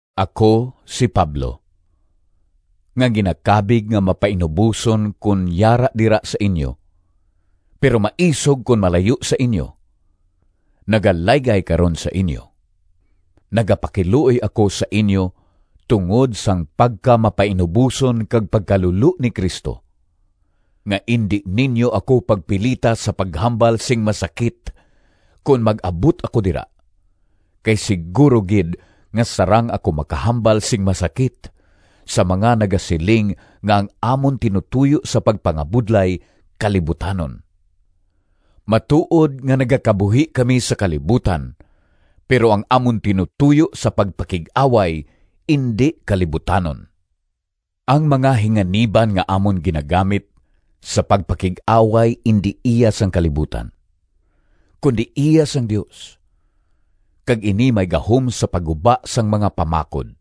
Ako, si Pablo, nga ginakabig nga mapainuboson kon yara dira sa inyo, pero maisog kon malayo sa inyo, nagalaygay karon sa inyo. Nagapakiluoy ako sa inyo tungod sang pagkamapainuboson kag pagkalulo ni Cristo, nga indi ninyo ako pagpilita sa paghambal sing masakit kon mag-abot ako dira, kay siguro gid nga sarang ako makahambal sing masakit sa mga nagasiling nga ang amon tinutoyo sa pagpangabudlay kalibutanon. Matuod nga nagakabuhi kami sa kalibutan, pero ang amon tinutoyo sa pagpakig-away indi kalibutanon. Ang mga hinganiban nga amon ginagamit sa pagpakig-away indi iya sang kalibutan, kundi iya sang Dios, kag ini may gahom sa pagguba sang mga pamakod.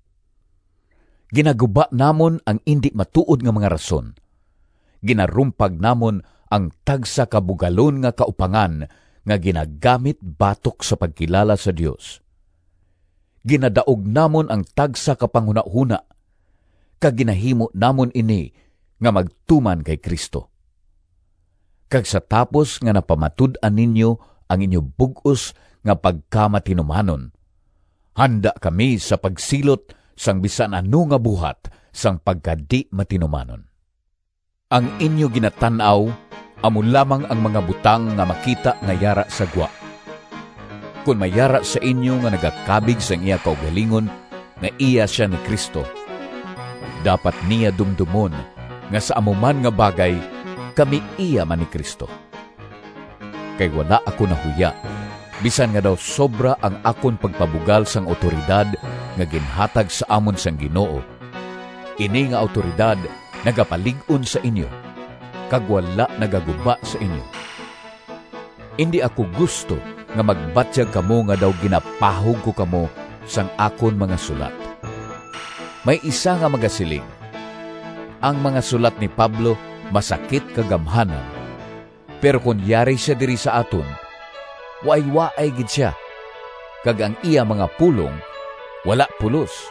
Ginaguba namon ang indi matuod nga mga rason, ginarumpag namon ang tagsa ka bugalon nga kaupangan nga ginagamit batok sa pagkilala sa Dios, ginadaog namon ang tagsa ka panghunahona kag ginahimo namon ini nga magtuman kay Cristo. Kag sa tapos nga napamatud-an ninyo ang inyo bug-os nga pagkamatinumanon, handa kami sa pagsilot sang bisan ano nga buhat sang pagkadi-matinumanon. Ang inyo ginatan-aw amo lamang ang mga butang nga makita nga yara sa gwa. Kon may yara sa inyo nga nagakabig sang iya kaugalingon nga iya sia ni Cristo, dapat niya dumdomon nga sa amo man nga bagay kami iya man ni Cristo. Kay wala ako nahuya, bisan nga daw sobra ang akon pagpabugal sang awtoridad nga ginhatag sa amon sang Ginoo—ini nga awtoridad nagapalig-on sa inyo, kag wala nagaguba sa inyo. Indi ako gusto nga magbatyag kamo nga daw ginapahog ko kamo sang akon mga sulat. May isa nga magasiling, “Ang mga sulat ni Pablo masakit kag gamhanan, pero kon yari sia diri sa aton waaywaay gid sia, kag ang iya mga pulong wala pulos!”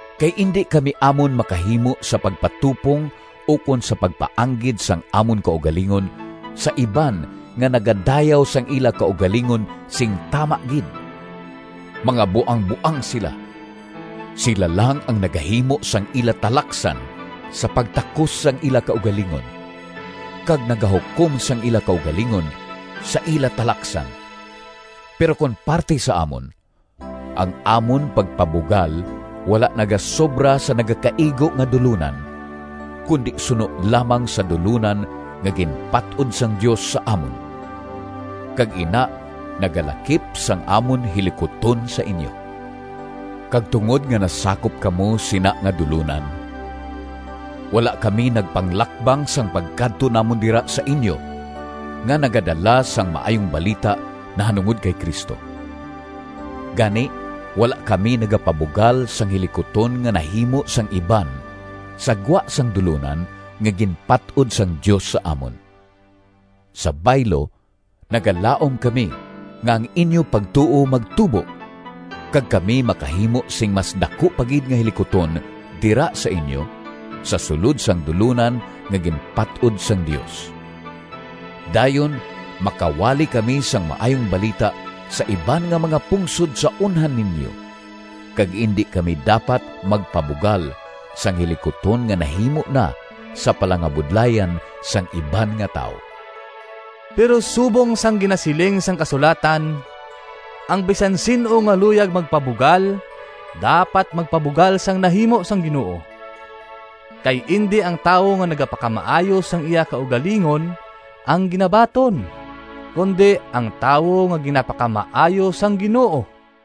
Kay indi kami amon makahimo sa pagpatupong ukon sa pagpaanggid sang amon kaugalingon sa iban nga nagadayaw sang ila kaugalingon sing tama gid. Mga buangboang sila! Sila lang ang nagahimo sang ila talaksan sa pagtakos sang ila kaugalingon, kag nagahukom sang ila kaugalingon sa ila talaksan! Pero kon parti sa amon, ang amon pagpabugal wala nagasobra sa nagakaigo nga dulonan, kundi suno lamang sa dulonan nga ginpat-od sang Dios sa amon, kag ina nagalakip sang amon hilikuton sa inyo. Kag tungod nga nasakop kamo sina nga dulonan, wala kami nagpanglakbang sang pagkadto namon dira sa inyo, nga nagadala sang Maayong Balita nahanungod kay Cristo. Gani wala kami nagapabugal sang hilikuton nga nahimo sang iban sa gwa sang dulonan nga ginpat-od sang Dios sa amon. Sa baylo, nagalaom kami nga ang inyo pagtuo magtubo, kag kami makahimo sing mas daku pa gid nga hilikuton dira sa inyo, sa sulod sang dulonan nga ginpat-od sang Dios. Dayon makawali kami sang Maayong Balita sa iban nga mga pungsod sa unhan ninyo, kag indi kami dapat magpabugal sang hilikuton nga nahimo na sa palangabudlayan sang iban nga tawo. Pero subong sang ginasiling sang kasulatan, “Ang bisan sin-o nga luyag magpabugal, dapat magpabugal sang nahimo sang Ginoo.” Kay indi ang tawo nga nagapakamaayo sang iya kaugalingon ang ginabaton, kundi ang tawo nga ginapakamaayo sang Ginoo.